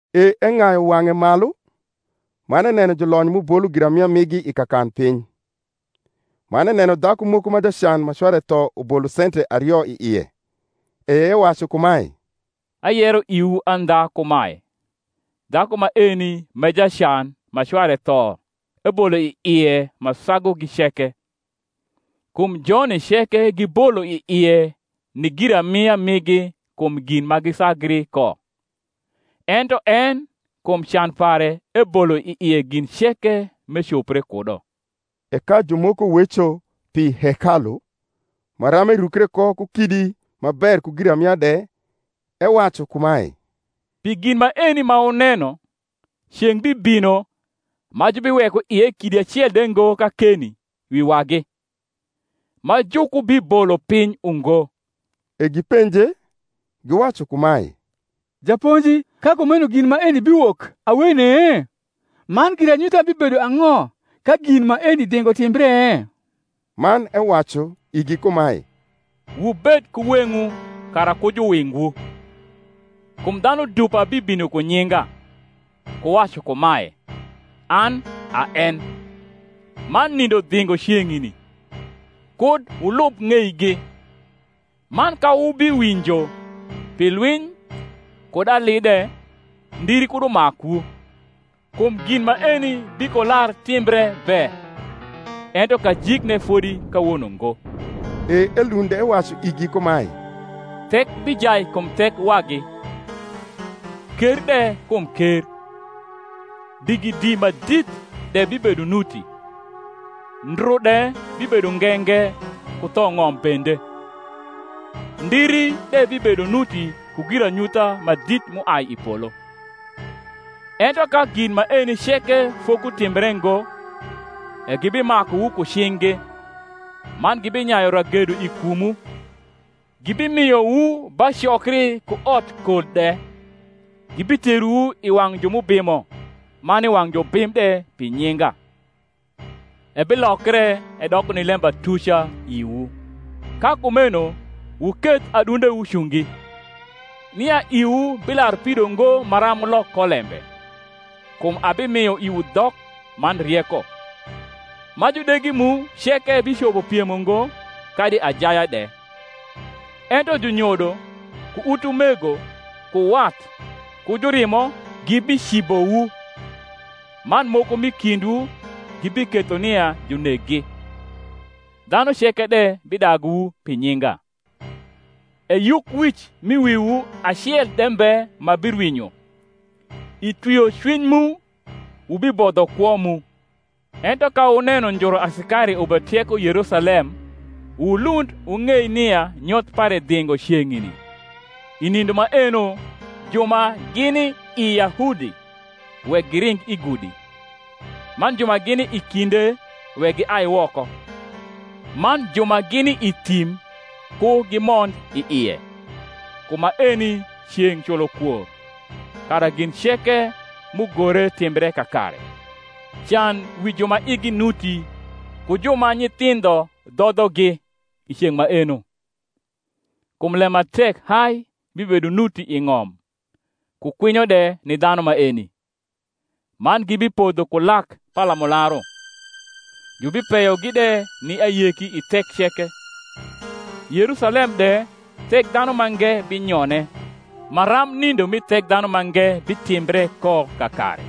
E eng’ayu wang’e malu, man eneno julonyo m’ubolo giramia migi i kakanpiny. Man eneno dhaku moko ma jacan ma cware tho ubolo sente ario i ie. E ewacu kumae, Ayero iwu andha kumae, Dhaku maeni m’e jacan ma cware tho ebolo i ie ma sagugi ceke: kum joni ceke gibolo i ie ni giramia migi kum gin ma gisagri ko; ento en kum can pare ebolo i ie gin ceke m’ecopre kudo. E ka jumoko weco pi hekalu, maram erukre ko ku kidi ma ber ku giramia de, ewacu kumae, Pi gin maeni ma wuneno, ceng’ bibmo, ma jubiweko ie kidi acel de ngo kakeni wi wagi, ma jukubibolo piny ungo. E gipenje, giwacu kumae, Japonji, ka kumeno gin maeni biwok awene? man giranyutha bibedo ang’o ka gin maeni dhingo timbre? Man ewacu igi kumae, Wubed ku weng’wu kara ku juwingwu. kum dhanu dupa bibino ku nyinga, ku wacu kumae, An a en; man, Nindo dhingo ceng’ni: kud wulub ng’eigi. Man ka wubiwinjo pi lwiny kud ali de, ndiri kud umakwu: kum gin maeni bikolar timbre be; ento kajikne fodi kawono ngo. E elund ewacu igi kumae, Thek bijai kum thek wagi, ker de kum ker; digidi ma dit de bibedo nuti, ndru de bibedo nge nge ku thong’om bende; ndiri de bibedo nuti ku giranyutha ma dit m’uai i polo. Ento ka gin maeni ceke fokutimbre ngo, e gibimakuwu ku cing’gi, man gibinyayu ragedo i kumwu, gibimiowu ba cokri ku otkol de, gibiterowu i wang’ ju m’ubimo man i wang’ jubim de pi nyinga. Ebilokre edoko ni lembatuca iwu. Ka kumeno wuketh adundewu cungi, nia iwu bilarpido ngo maram wulok ko lembe: kum abimio iwu dhok man rieko, ma judegi mu ceke bicopo piemo ngo kadi ajaya de. Ento junyodo, ku utumego, ku wat, ku jurimo gibicibowu; man moko m’i kindwu gibiketho nia juneggi. Dhanu ceke de bidaguwu pi nyinga. E yukwic mi wiwu acel de mbe ma birwinyo. I twiocwiny mu wubibodho kwo mu. Ento ka wuneno njuru asikari ubetieko Yerusalem wulund wung’ei nia nyoth pare dhingo ceng’ni. I nindo maeno ju ma gini i Yahudi wek giring i gudi: man ju ma gini i kinde wek giai woko; man ju ma gini i thim ku gimond i ie. Kum maeni ceng’ culokwor, kara gin ceke m’ugore timbre kakare. Can wi ju ma igi nuti ku ju ma nyithindho dhodhogi i ceng’ maeno! kum lem ma tek hai bibedo nuti i ng’om, ku kwinyo de ni dhanu maeni. Man gibipodho ku lak palamularu, jubipeyogi de ni ayeki i thek ceke: Yerusalem de Thekdhanumange binyone, maram nindo mi Thekdhanumange bitimbre ko kakare.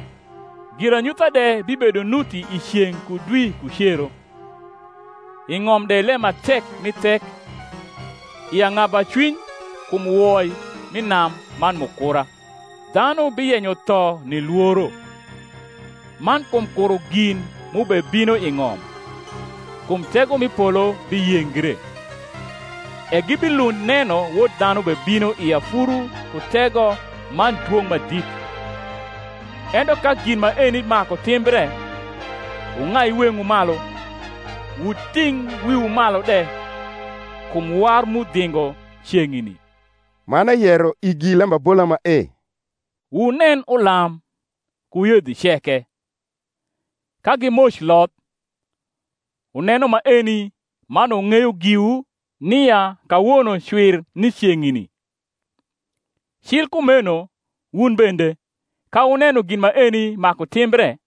Giranyutha de bibedo nuti i ceng’ ku dwi ku cero; i ng’om de lem ma tek mi thek, i ang’abacwiny kum woi mi nam man mukura; dhanu biyenyo tho ni lworo, man kum kuro gin m’ubebino i ng’om: kum tego mi polo biyengre. E gibilund neno Wod dhanu bebino i afuru ku tego man dwong’ ma dit. Ento ka gin maeni maku timbre, wung’ai weng’wu malu, wuting’ wiwu malu de; kum war mu dhingo ceng’ni. Man eyero igi lembabola mae: Wunen ulam, ku yedhi ceke: ka gimoc loth, wuneno maeni man wung’eyo giwu nia kawono cwir ni ceng’ni. Cil kumeno wun bende, ka wuneno gin maeni maku timbre,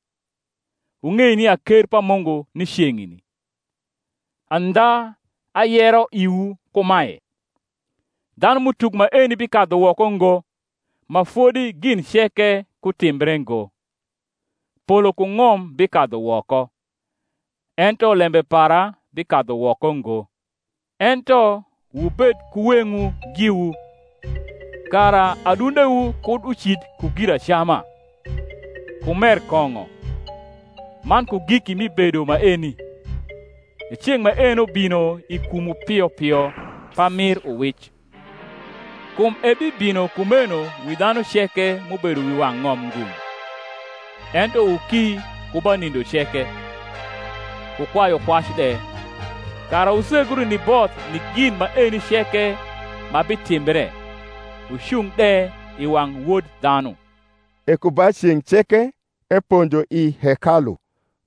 wung’ei nia ker pa Mungu ni ceng’ni. Andha ayero iwu kumae, dhanum’utuk maeni bikadhu woko ngo, ma fodi gin ceke kutimbre ngo. Polo ku ng’om bikadhu woko: ento lembe para bikadhu woko ngo. Ento wubed ku weng’wu giwu, kara adundewu kud ucid ku giracama, ku mer kong’o, man ku giki mi bedo maeni, e ceng’ maeno bino i kumwu pio pio pamir uwic: kum ebibino kumeno wi dhanu ceke m’ubedo wi wang’ ng’om ngung’. Ento wuki ku ba nindo ceke, ku kwayukwac de, kara wusegru ni both ni gin maeni ceke ma bitimbre, wucung de i wang’ Wod dhanu. E ku ba ceng’ ceke eponjo i hekalu;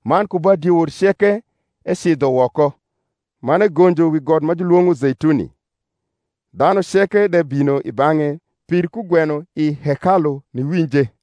man ku ba diewor ceke ecidho woko, man egonjo wi got ma julwong’o Zeituni. Dhanuceke de bino i bang’e pir kugweno i hekalu niwinje.